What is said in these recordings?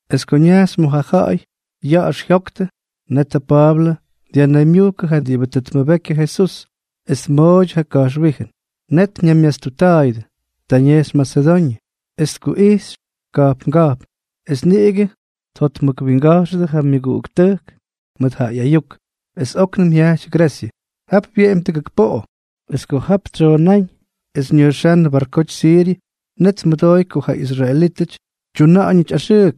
Es ko ñajxy ma̱ ja̱ꞌa̱y ya̱ꞌa̱x jyoktʉ, net ja Pa̱a̱blʉ dyajnaymyujkʉ ja diꞌibʉ tʉ tmʉbeky ja Jesús, es tmooydyʉ ja ka̱jxwíjʉn. Net ñaymyastutta̱a̱yʉdʉ. Ta ñejxy Masedoñʉ, es tkuꞌijxy ka̱jpnga̱jpn, es niꞌigʉ tjotmʉkwinga̱jxʉdʉ ja myʉguꞌuktʉjk mʉt ja ꞌyayuk, es óknʉm jyajty Gresyʉ. Jap wyeꞌemy tʉgʉk poꞌo. Es ko jap tsyoonáñ es ñʉjxánnʉ barkoty Siryʉ, net tmʉdooy ko ja israelítʉty tyuna̱ꞌa̱ñʉty axʉʉk.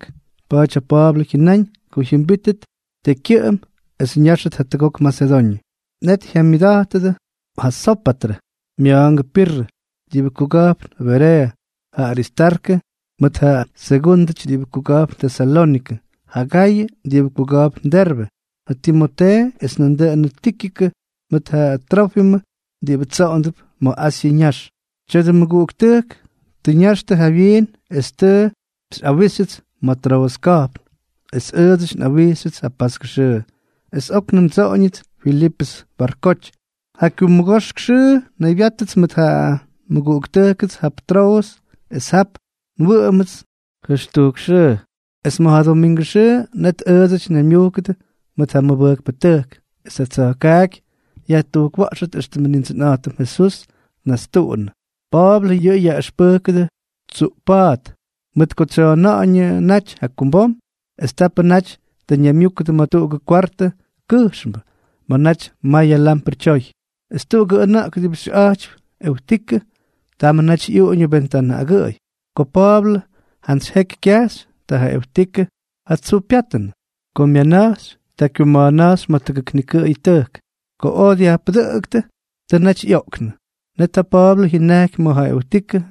Pa̱a̱ty ja Pa̱a̱blʉ jyʉnáñ ko jyʉmbítʉt tekykyʉꞌʉm es ñáxʉt jatʉgok Masedoñʉ. Net jyamyʉʉtꞌa̱jtʉdʉ ja Sópatrʉ, mya̱a̱ngʉ Pirrʉ, diꞌibʉ kuga̱jpn Bereeʉ, ja Aristarkʉ mʉt ja Segundʉ diꞌibʉty kuga̱jpn Tesalónikʉ, ja Gayʉ diꞌibʉ kuga̱jpn Derbe, ja Timotee, es nandʉꞌʉnʉ Tíkikʉ mʉt ja Trófimʉ diꞌibʉ tsoꞌondʉp ma̱ Asyʉ ñax. Tya̱dʉ mʉguꞌuktʉjk tʉ ña̱jxtʉ jawyiin es tʉ xyꞌawíxtʉts ma̱ Troʉs ka̱jpn. Es ʉʉdsʉty nꞌawijxyʉts ja paskʉ xʉʉ, es óknʉm ndsoꞌoñʉts Filipʉs barkoty. Ja kyummʉgoxk xʉʉ nnaybyáttʉts mʉt ja nmʉguꞌuktʉjkʉts jap Troʉs, es jap nwʉꞌʉmʉts jʉxtujk xʉʉ. Es ma̱ ja domingʉ xʉʉ, net ʉʉdsʉty nnaymyujkʉdʉ mʉt ja mʉbʉjkpʉtʉjk, es ja tsa̱jkaaky yajtujkwa̱ꞌxʉt éxtʉmʉ Nindsʉnꞌa̱jtʉm Jesús tnastuꞌunʉ. Pa̱a̱blʉ yʉꞌʉ yaꞌʉxpʉjkʉdʉ tsuꞌp pa̱a̱t, mʉt ko tsyoona̱ꞌa̱ñʉ naty jakumbom. Es tapʉ naty tʉ ñaymyúkʉdʉ ma̱ tuꞌugʉ kwartʉ kʉjxmbʉ, ma̱ naty mayʉ lamprʉ tyoy. Es tuꞌugʉ ʉna̱ꞌk diꞌibʉ xyʉꞌa̱jtypy Eutikʉ, tamʉ naty ꞌyuꞌuñʉ ventanʉ agʉꞌʉy. Ko Pa̱a̱blʉ jantsy jeky kyajxy, ta ja Eutikʉ ja tsuu pyátʉnʉ. Ko myana̱jxy, ta kyuma̱a̱na̱jxy ma̱ tʉgʉk nikʉꞌʉyʉ tʉjk. Ko oj dyajpʉdʉꞌʉktʉ, tʉ naty ꞌyoꞌknʉ. Net ja Pa̱a̱blʉ jyʉnajky ma̱ ja Eutikʉ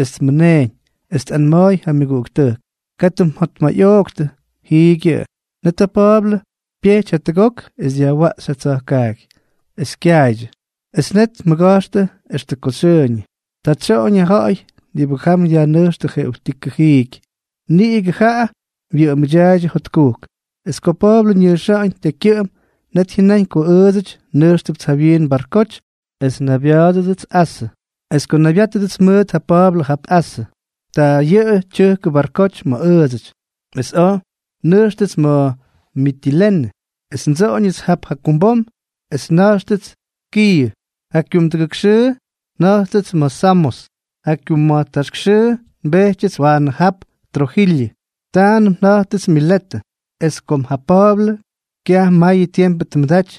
es tmʉneeñ, es tꞌanma̱a̱y ja myʉguꞌuktʉjk: —Katʉ mjotmayꞌooktʉ. Jiigyʉꞌʉ. Net ja Pa̱a̱blʉ pyejty jatʉgok es dyajwaꞌxy ja tsa̱jkaaky, es kyaaydyʉ. Es net tmʉga̱jxtʉ extʉ ko xyʉʉñʉ. Ta tsyoꞌoñ. Ja ja̱ꞌa̱y diꞌibʉ jam dyajnʉjxtʉ ja Eutikʉ jiiky, niꞌigʉ jaꞌa wyʉꞌʉmda̱a̱ydyʉ jotkujk. Es ko Pa̱a̱blʉ ñʉjxa̱ꞌa̱ñ tekykyʉꞌʉm, net jyʉnáñ ko ʉʉdsʉty nʉjxtʉpts jawyiin barkoty es nnaybya̱a̱dʉdʉts Asʉ. Es ko nnaybyátʉdʉts mʉt ja Pa̱a̱blʉ jap Asʉ, ta yʉꞌʉ tyʉjkʉ barkoty ma̱ ʉʉdsʉty, es oj nnʉjxtʉts ma̱ Mitilene. Es ndsoꞌoñʉts jap jakumbom es nna̱jxtʉts Kiiʉ. Ja kyumdʉgʉk xʉʉ nja̱jttʉts ma̱ Samos. Ja kyumma̱jtaxxʉʉ nbeꞌxyʉts waanʉ jap Trojilyʉ. Taanʉm nja̱jttʉts Miletʉ. Es kom ja Pa̱a̱blʉ kyaj mayʉ tiempʉ tmʉdaty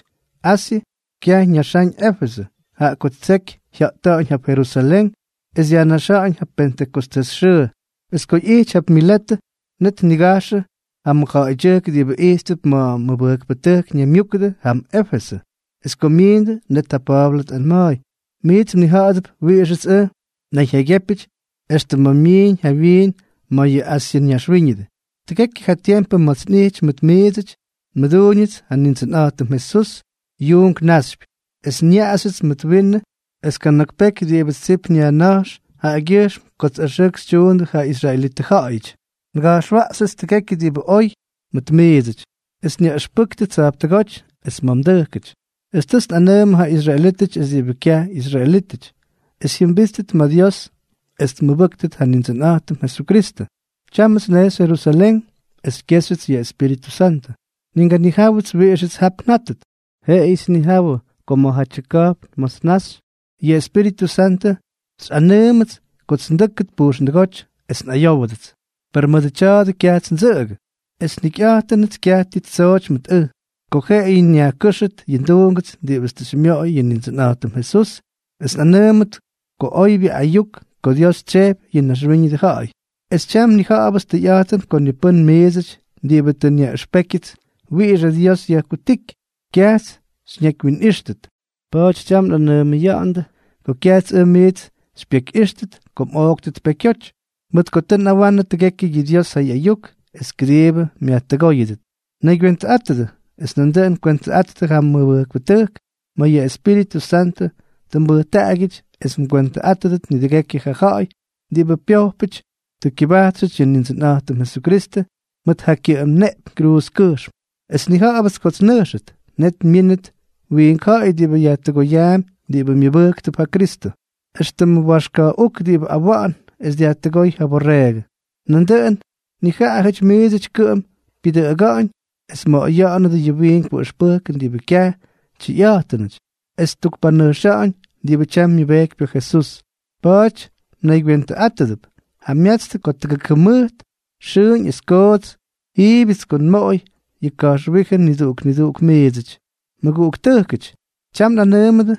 Asyʉ, kyaj ñʉjxáñ Éfesʉ, jaꞌa ko tsejkyʉ jya̱ꞌta̱ꞌa̱ñ jap Jerusalén es dyajnaxa̱ꞌa̱ñ ja Pentʉkostés xʉʉ. Es ko ꞌyijty jap Miletʉ, net tnigajxʉ ja mʉjja̱ꞌa̱ydyʉjk diꞌibʉ ijttʉp ma̱ mʉbʉjkpʉtʉjk ñaymyúkʉdʉ jam Éfesʉ. Es ko myiindʉ, net ja Pa̱a̱blʉ tꞌanma̱a̱y: —Miits mnija̱ꞌa̱dʉp wiꞌixʉts ʉj nnayjyaygyépyʉty extʉ ma̱ nmiiñ jawyiin ma̱ yʉ Asyʉ ñaxwíñʉdʉ. Tʉgekyʉ ja tiempʉ ma̱ts nꞌijty mʉt miidsʉty, nmʉduuñʉts ja Nindsʉnꞌa̱jtʉm Jesús yuunk naxypy, es nyaꞌaxyʉts mʉdʉ winnʉʉ, es kana̱k peky diꞌibʉts tsip nyajña̱jx jaꞌagyʉjxm kots axʉʉk xytyuundʉ ja israelitʉ ja̱ꞌa̱yʉty. Nga̱jxwaꞌxyʉts tʉgekyʉ diꞌibʉ oy mʉt miidsʉty, es nyaꞌʉxpʉjktʉ tsa̱jptʉgóty es ma̱ mdʉjkʉty. Es tʉts nꞌanʉʉmʉ ja israelítʉty es diꞌibʉ kyaj ꞌyisraelítʉty, es jyʉmbíttʉt ma̱ Dios es tmʉbʉ́ktʉt ja Nindsʉnꞌa̱jtʉm Jesukristʉ. Tyámʉts nnejxy Jerusalén, es xykyéxyʉts yʉ Espíritʉ Santʉ, ni nganijáwʉts wiꞌixʉts jap njátʉt. Jeꞌeyʉts nnijawʉ ko ma̱jatyʉ ka̱jpn ma̱ts nnaxy, yʉ Espíritʉ Santʉ xyꞌanʉʉmʉts kots ndʉ́kʉt pujxndʉgóty es nꞌayówʉdʉts. Per mʉdʉ tya̱a̱dʉ kyajts ndsʉꞌʉgʉ. Esʉ njikyꞌa̱jtʉnʉts kyaj ti ttsooty mʉt ʉj, ko jeꞌeyʉ nyajkʉ́xʉt yʉ nduungʉts diꞌibʉts tʉ xymyoꞌoy yʉ Nindsʉnꞌa̱jtʉm Jesús es nꞌanʉʉmʉt ja oybyʉ ayuk ko Dios tsyejpy yʉ naxwíñʉdʉ ja̱ꞌa̱y. ’Es tyam nnija̱ꞌa̱bʉts tʉyꞌa̱jtʉn ko ni pʉ́n miidsʉty diꞌibʉ tʉ nyaꞌʉxpékyʉts wiꞌix ja Dios yajkutíky, kyajts xyñakywyinꞌíxtʉt. Pa̱a̱ty tyam nꞌanʉʉmʉya̱ꞌa̱ndʉ ko kyajts ʉj miits xypyekyꞌíxtʉt ko mꞌooktʉt pekyoty, mʉt ko tʉ nꞌawanʉ tʉgekyʉ yʉ Dios ja ꞌyayuk es kʉdiibʉ myajtʉgóyʉdʉt. Naygywentʉꞌátʉdʉ, es nandʉꞌʉn kwentʉꞌattʉ ja mʉbʉjkpʉtʉjk ma̱ yʉ Espíritʉ Santʉ tʉ mbʉjtaꞌagyʉty es xykywentʉꞌáttʉt nidʉgekyʉ ja ja̱ꞌa̱y diꞌibʉ pyojpʉty tʉ tkʉbajtxʉty yʉ Nindsʉnꞌa̱jtʉm Jesukristʉ mʉt ja kyʉꞌʉm neꞌpyñ kruuzkʉjxm. ’Es nnija̱ꞌa̱bʉts kots nnʉjxʉt, net myínʉt wiink ja̱ꞌa̱y diꞌibʉ yajtʉgoyaampy yʉ diꞌibʉ myʉbʉjktʉp ja Kristʉ, éxtʉmʉ waxka̱ꞌuk diꞌibʉ awa̱ꞌa̱n es dyajtʉgóy yʉ borreegʉ. Nandʉꞌʉn nijaꞌajʉty miidsʉty kʉꞌʉm pyʉdʉꞌʉga̱ꞌa̱ñ, es mmoꞌoya̱ꞌa̱nʉdʉ yʉ wiinkpʉ ʉxpʉjkʉn diꞌibʉ kyaj tyʉyꞌa̱jtʉnʉty, es ttukpanʉjxa̱ꞌa̱ñ diꞌibʉ tyam myʉbejkypy ja Jesús. Pa̱a̱ty mnaygywentʉꞌátʉdʉp. Jamyatstʉ ko tʉgʉk jʉmʉjt, xʉʉñ es koots, jiibʉts ko nmoꞌoy yʉ ka̱jxwíjʉn niduꞌuk niduꞌuk miidsʉty. ’Mʉguꞌuktʉjkʉty, tyam nꞌanʉʉmʉdʉ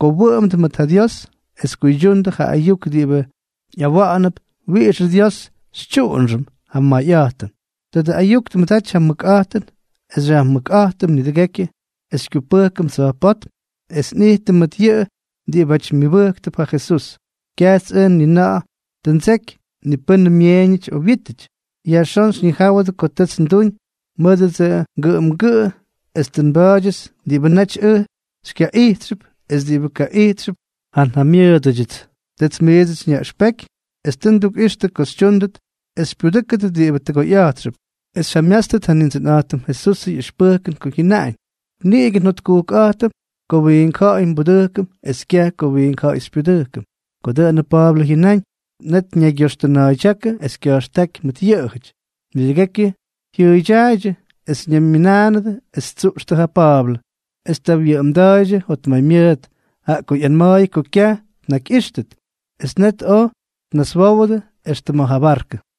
ko wʉꞌʉmdʉ mʉt ja Dios es kuydyundʉ ja ayuk diꞌibʉ ꞌyawa̱ꞌa̱nʉp wiꞌixʉ Dios xytyuꞌunxʉm ja mayꞌa̱jtʉn. Tadʉ ayuk tmʉdaty ja mʉkꞌa̱jtʉn es xyajmʉkꞌa̱jtʉm nidʉgekyʉ es xykyupʉjkʉm tsa̱jpótm es nꞌijtʉm mʉt yʉꞌʉ diꞌibáty myʉbʉjktʉp ja Jesús. Kyajts ʉj ni na̱ꞌa̱ tʉ ndseky ni pʉ́nʉ myeeñʉty o ja wyítʉty. Yajxón xyñijáwʉdʉ ko tʉts nduñ mʉdʉts ngʉꞌʉmgʉꞌʉ es tʉ nba̱a̱dyʉts diꞌibʉ naty ʉj xykyaꞌijtxʉp es diꞌibʉ kaꞌijtxʉp ja njamyʉʉdʉdyʉts. Tʉts miidsʉty nyaꞌʉxpeky es tʉ ndukꞌixtʉ ko xytyúndʉt es xypyudʉ́kʉdʉt diꞌibʉ tʉgoyꞌa̱jtxʉp, es xyjamyátstʉt ja Nindsʉnꞌa̱jtʉm Jesusʉ ꞌyʉxpʉjkʉn ko jyʉnáñ: “Niꞌigʉ njotkujkꞌa̱jtʉm ko wiink ja̱ꞌa̱y nbudʉjkʉm es kyaj ko wiink ja̱ꞌa̱y xypyudʉjkʉm.” Ko dʉꞌʉnʉ Pa̱a̱blʉ jyʉnáñ, net ñaygyoxtʉna̱a̱ydyákʉ es kya̱jxtáky mʉt yʉꞌʉjʉty. Nidʉgekyʉ jyʉʉydyaaydyʉ, es ñaymyʉnánʉdʉ es ttsuꞌxtʉ ja Pa̱a̱blʉ. Es ta wyʉꞌʉmda̱a̱ydyʉ jotmaymyʉʉt, jaꞌa ko ꞌyanma̱a̱yʉ ko kyaj tnakyꞌíxtʉt. Es net oj tnaswówʉdʉ extʉ ma̱ ja barkʉ.